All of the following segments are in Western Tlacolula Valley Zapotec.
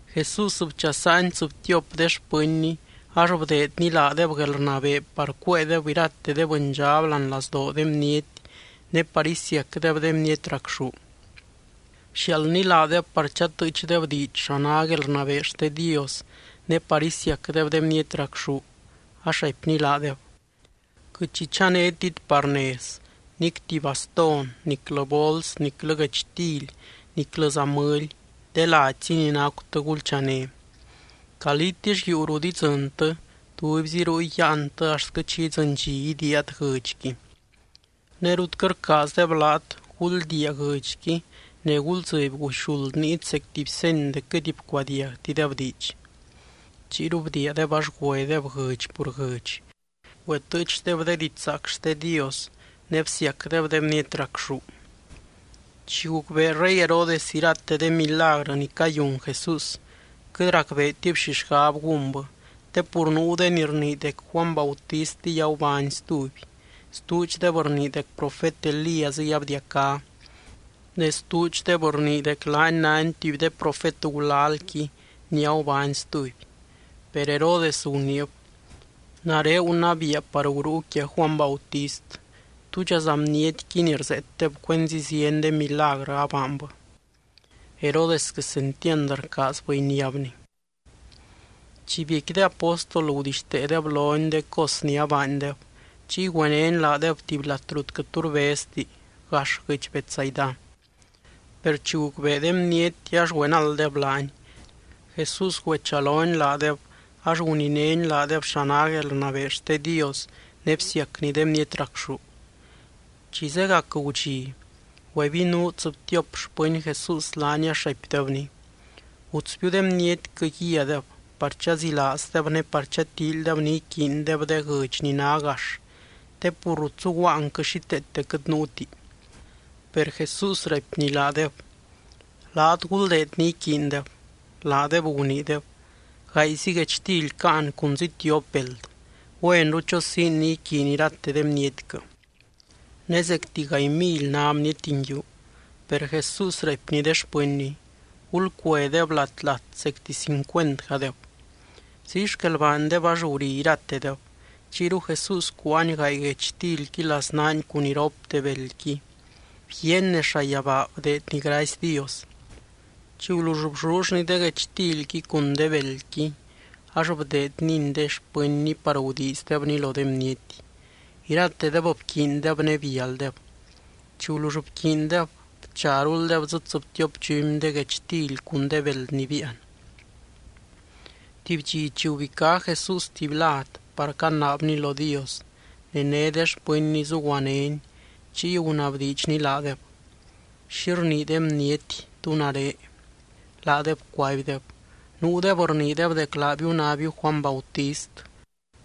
Jesús bchasaany tsɨbtiop de xpɨnny ax bdeedny laadeb guelrnabee par cuéedeb irate de bɨndxab láani lazdoo de bniety ne par isiacdeb de bniety racxú. Bxiaaldny laadeb par chatɨɨchdeb diidx xa ná guelrnabee xte Dios, ne par isiacdeb de bniety racxú, ax raipny laadeb: —Quɨt xi chanétit par nez, nic tuby bastón, niclɨ bols, niclɨ guechtily, niclɨza mɨly. De ladyzi ni nacutɨ gulchané. Calítill yuu rut idzɨntɨ, tubyzi ruy yáantɨ axtquɨ chi idzɨny dxi idiiat guɨdxqui. Ne rut quɨt rcaazdeb laat, guldiia guɨdxqui ne guldzɨby guxuld niit zec tuby seny dec quɨt bcuadiagtideb diidx. Chiyru bdiiadeb ax güedeb guɨdx pur guɨdx. Güetɨɨchdeb de didxzaac xte Dios ne bsiacdeb de bniety racxú. Chi gucbee rey Herodes irate de milagrɨ ni cayun Jesús, quɨt racbeetib xi xgab gúnbɨ. Te pur nuu de ni rnii dec Juany Bautistiy agubány stuby. Stuudxdeb rnii dec profet Elíasiy abdiacá. Ne stuudxdeb rnii dec laany nány tuby de profet gulalqui ni agubány stuby. Per Herodes guniib: —Nare gunabiia par gurúu quia Juany Bautist. ¿Túdxaza bnietqui ni rzeetdeb cuenzi zieny de milagrɨ abaanbɨ? Herodes quesentiand rcaazbɨ iniábny. Chi biecqui de apóstol, gudixteedeb lony de cos ni abaandeb. Chiy güenény laadeb tuby lat rut quɨt tu rbezti, gax guɨdx Betsaida. Per chi gucbee de bniety ax güenalddeb laany. Jesús güechalony laadeb ax guninény laadeb xa ná guelrnabee xte Dios ne bsiacny de bniety racxú. Chi zegac gudxi, güebinuu tsɨbtiop xpɨny Jesús laany ax raipdebny: —Gutsbiu de bnietquɨ guíadeb, par chazilaazdeb ne par chatíilydeb ni iquiindeb de guɨdx ni ná gax, te pur rut zuguaanquɨ xíteete quɨt nuuti. Per Jesús raipny laadeb: —Laat, guldeed ni iquiindeb. Laadeb guniideb: —Gaayzi guechtily caan cunzi tiop beld. Güenru chosiin ni iquiiny irate de bnietquɨ. Ne zecti gaay mily ná bniety nguiu. Per Jesús raipny de xpɨnny: —Gulcuedeb lat, lat zecti cincuentgadeb. Ziy xquel baandeb ax guri iratedeb. Chiyru Jesús cuáany gaay guechtilqui laznaany cun iropte beldqui. Bguiaany nez llayabaa bdeedny gracy Dios. Chi gulull bllullny de guechtilqui cun de beldqui, ax bdeednyni de xpɨnny par gudiizdebni lo de bniety. Iratedeb bquiindeb ne bialdeb. Chi gulull bquiindeb, bcharuldeb dzɨ tsɨbtiop dxumy de guechtily cun de beld ni biian. Tuby dxi chi gubicá Jesús tuby lad par canaabny lo Dios ne né de xpɨnny zuguanény, chiy gunabdiidxny laadeb: —¿Xi rnii de bniety, tú nare? Laadeb cuaibdeb: —Nuudeb rniideb dec laabiu nábiu Juany Bautist.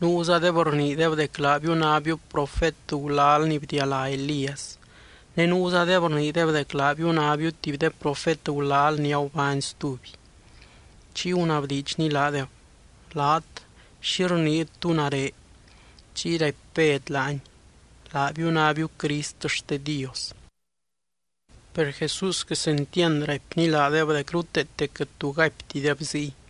Nuuzadeb rniideb dec laabiu nábiu profet gulal ni bdialá Elías. Ne nuuzadeb rniideb dec laabiu nábiu tuby de profet gulal ni agubány stuby. Chiy gunabdiidxny laadeb: —Laat, ¿xi rniit, tú nare? Chiy raipy Bed laany: —Laabiu nábiu Crist xte Dios. Per Jesús quesentiand raipny laadeb dec ruteete quɨt tu gaiptideb ziy,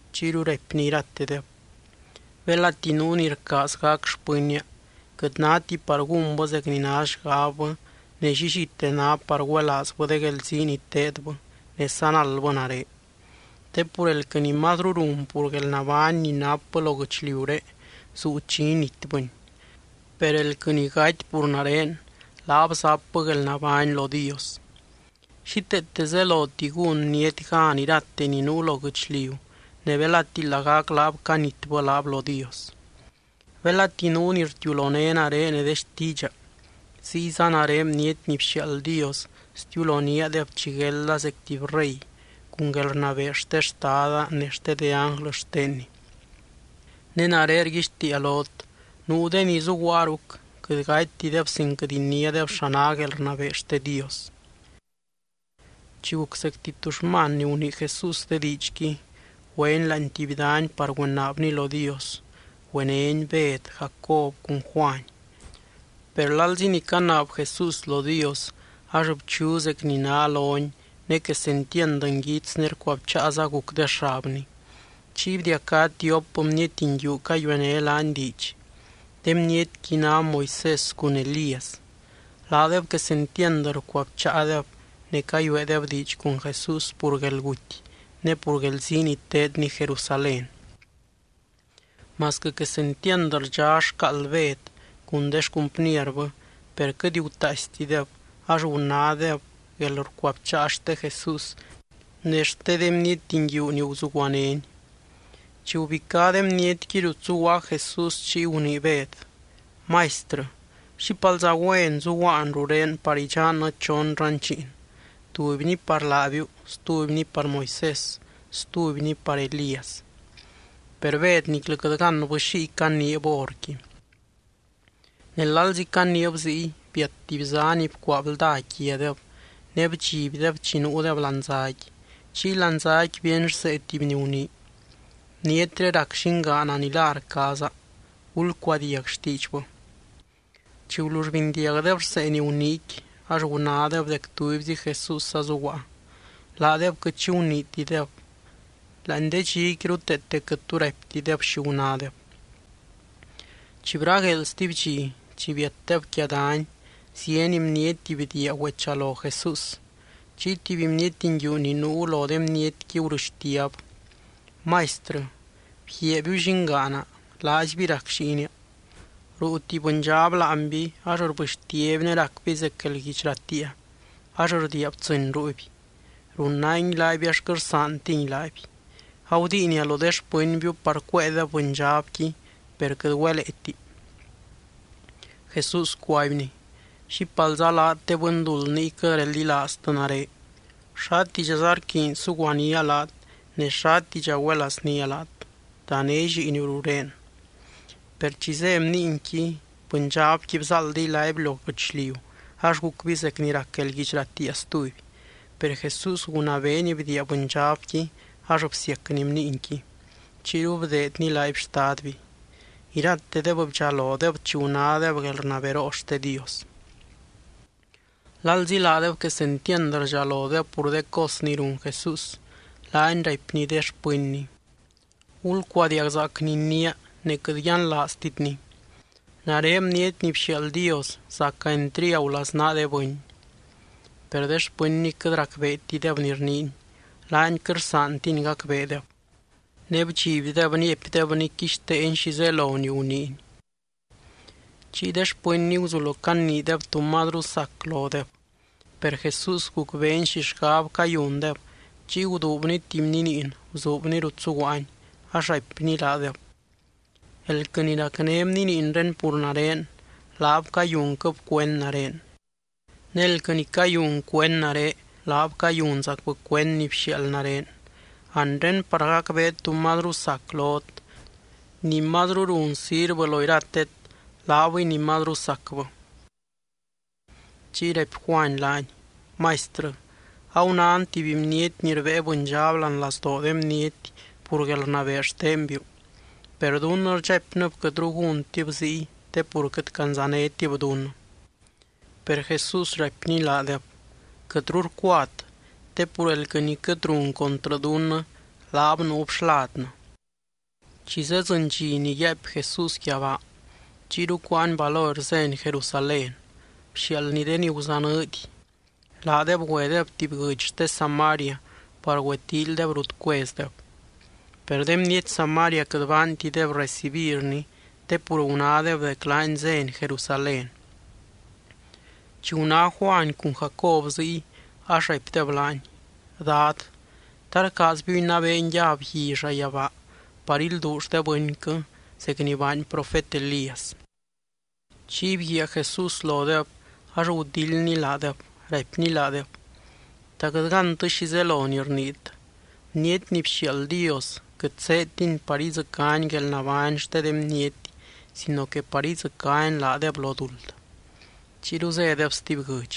Chiyru raipny iratedeb: —Belati nuu ni rcaaz gac xpɨnnia, quɨt náti par gúnbɨ zec ni ná xgabbɨ ne llillite ná par güelaazbɨ de guelzii ni teedbɨ ne sanaldbɨ nare. Te pur elquɨ ni mazru run pur guelnabány ni napbɨ lo guɨchliuré zuu chi initbɨni. Per elquɨ ni gaty pur nare, laab zapbɨ guelnabány lo Dios. Xíteete zeloti gún bniety gan irate ni nuu lo guɨchliu ne belati lagac laab canitbɨ laab lo Dios. Belati nuu ni rtiuloné nare ne de xtiidxa, ziyza nare Bniety ni bxiaald Dios stiuloníadeb chi guelda zec tuby rey, cun guelrnabee xte Xtada ne xte de ánglɨ xtenny. Ne nare rguixtiia lot: nuu de ni zuguaa ruc quɨt gatydeb sin quɨt iniádeb xa ná guelrnabee xte Dios. Chi guc zecti tuxman ni gunii Jesús de diidxqui, güeny láani tuby dany par güenaabny lo Dios. Güenény Bed, Jacob cun Juany. Per lalzi ni canaab Jesús lo Dios, ax bchu zec ni ná lony ne quesentiand nguits ne rcuabcháaza guc de xabny. Chiy bdiacá tiop bniety nguiu cayuené laany diidx. De bnietqui ná Moisés cun Elías. Laadeb quesentiand rcuabcháadeb ne cayueedeb diidx cun Jesús pur guelguty ne pur guelzii ni teedny Jerusalén. Masquɨ quesentiand rdxá xcaald Bed cun de xcumpnierbɨ, per quɨt gutaaistideb ax gunádeb guelrcuabcháa xte Jesús ne xte de bniety nguiu ni guzuguanény. Chi gubicá de bnietqui rut zuguaa Jesús, chiy gunii Bed: —Maistrɨ, ¡xípalza güen zuguaan rurén par idxannɨ chon ranchiin, tubyni par laabiu, stubyni par Moisés, stubyni par Elías! Per Bed niclɨ quɨt gánbɨ xiy caniib horqui. Ne lalzi caniib ziy, biat tuby zá ni bcuaa blda quiadeb ne bdxibdeb chi nuudeb láani záqui. Chiy láani záqui bíeny rsee tuby ni gunii: —Bnietré rac Llingaana ni la rcaaza. Gulcuadiag xtiidxbɨ. Chi gulull bindiagdeb rsee ni guniiqui, ax gunádeb dec tubyzi Jesús azuguaa. Laadeb quɨt xi guniitideb. Láani de dxiqui ruteete quɨt tu raiptideb xi gunádeb. Chi bragueel stuby dxi, chi biatdeb quia dany, zieny bniety bdiia güechalo Jesús. Chiy tuby bniety nguiu ni nuu lo de bnietqui gurɨxtiab: —Maistrɨ, bguiaabiu llingaana, laaizby rac lliinia. Ruu tuby bɨndxab láanby ax rbɨxtiaby ne racby zec guelguidx ratiia ax rdiia btsɨ́ny ruuby. Runangui laaby ax quɨt rsaantingui laaby. Agudiinia lo de xpɨnbiu par cuéedeb bɨndxabqui, per quɨt güeleeti. Jesús cuaibny: —¡Xípalza laat de bɨnduld niy quɨt reldilaaztɨ nare! ¿Xátidxaza rquiiny suguanía laat ne xátidxa güelaaznía laat? Dané lliiniu rurén. Per chi zé bniinqui, bɨndxabqui bzáaldiy laaby lo guɨchliu ax gucby zec ni rac guelguidx ratiia stuby. Per Jesús gunabeeny bdiia bɨndxabqui ax bsiacny bniinqui. Chiyru bdeedny laaby xtadby. Iratedeb bdxalodeb chi gunádeb guelrnaberoo xte Dios. Lalzi laadeb quesentiand rdxalodeb pur de cos ni run Jesús, laany raipny de xpɨnny: —Gulcuadiagzaac ni iniia ne quɨt yianlaaztitni. Nare Bniety ni bxiaald Dios, zaca entriagu laznaa de bɨny. Per de xpɨnny quɨt racbeetideb ni rniiny. Laany quɨt rsaantiny gacbeedeb. Ne bdxibdeb niapydebny quixteeny xi zelo ni guniiny. Chiy de xpɨnny guzulo caniideb tú mazru sac lodeb. Per Jesús gucbeeny xi xgab cayundeb. Chiy guduubny tuby bniniin, bzuubny rut zuguaany, ax raipny laadeb: —Elquɨ ni racné bniniinré pur nare, laab cayunquɨb cuend nare. Ne elquɨ ni cayun cuend nare, laab cayunzacbɨ cuend ni bxiaald nare. Anre par gacbeet tú mazru sac lot: ni mazru run sirvɨ lo iratet, laabɨy ni mazru sacbɨ. Chiy raipy Juany laany: —Maistrɨ, agunán tuby bniety ni rbée bɨndxab láani lazdoo de bniety pur guelrnabee xtenbiu. Per dunnɨ rdxaipnɨb quɨtru gúntib ziy te pur quɨt candzanétib dunnɨ. Per Jesús raipny laadeb: —Quɨtru rcuat. Te pur elquɨ ni quɨt run contrɨ dunnɨ, laab nuub xladnɨ. Chi zeddzɨny dxi ni yaaipy Jesús yabaa, chiyru cuáany valor zény Jerusalén. Bxiaaldny de ni guzanɨɨdy, laadeb güedeb tuby guɨdx xte Samaria par güetíilydeb rut cuezdeb. Per de bniety Samaria quɨt baantideb recibirny te pur gunádeb dec laany zény Jerusalén. Chi guná Juany cun Jacob ziy ax raipdeb laany: —Dad, ¿ta rcaazbiu inabeen yab gui llayabaa par ilduull de bɨnquɨ zec ni baany profet Elías? Chiy bguiaa Jesús lodeb ax gudildny laadeb, raipny laadeb: —¿Ta quɨt gántɨ xi zelo ni rniit? Bniety ni bxiaald Dios quɨt zéedtiny par idzɨcány guelnabány xte de bniety sino que par idzɨcány laadeb lo duld. Chiyru zédeb stuby guɨdx.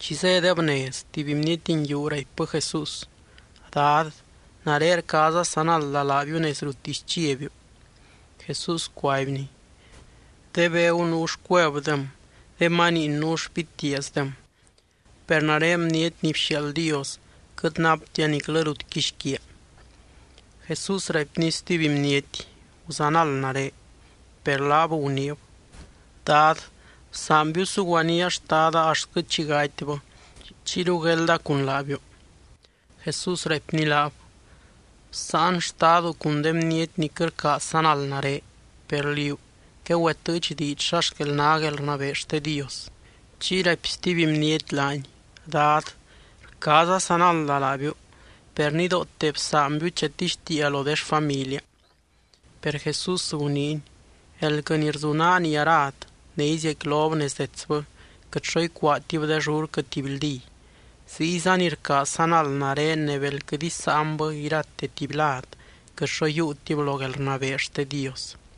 Chi zédeb nez, tuby bniety nguiu raipbɨ Jesús: —Dad, nare rcaaza sanalda laabiu nez ruttisy chiabiu. Jesús cuaibny: —De begu nuu xcuevdem. De maniin nuu xpitiaazdem. Per nare Bniety ni bxiaald Dios quɨt naptia niclɨ rut quixquiaa. Jesús raipny stuby bniety: —Guzanald nare. Per laab guniib: —Dad, bsaanbiu suguanía xtada axtquɨ chi gatybɨ. Chiyru guelda cun laabiu. Jesús raipny laab: —Bsáan xtadu cun de bniety ni quɨt rcaaz sanald nare. Per liú, quegüetɨɨch diidx xa xquel ná guelrnabee xte Dios. Chiy raipy stuby bniety laany: —Dad, rcaaza sanalda laabiu, per nidoote bsaanbiu chatixtiia lo de xfamilia. Per Jesús guniiny: —Elquɨ ni rzunaa nii arad, ne iziecquilob nez detsbɨ, quɨt xo icuaatib de llurquɨ tibyldí. Ziyza ni rcaaz sanald nare ne bel quɨt isáanbɨ irate tuby lad, quɨt xo yiiutib lo guelrnabee xte Dios.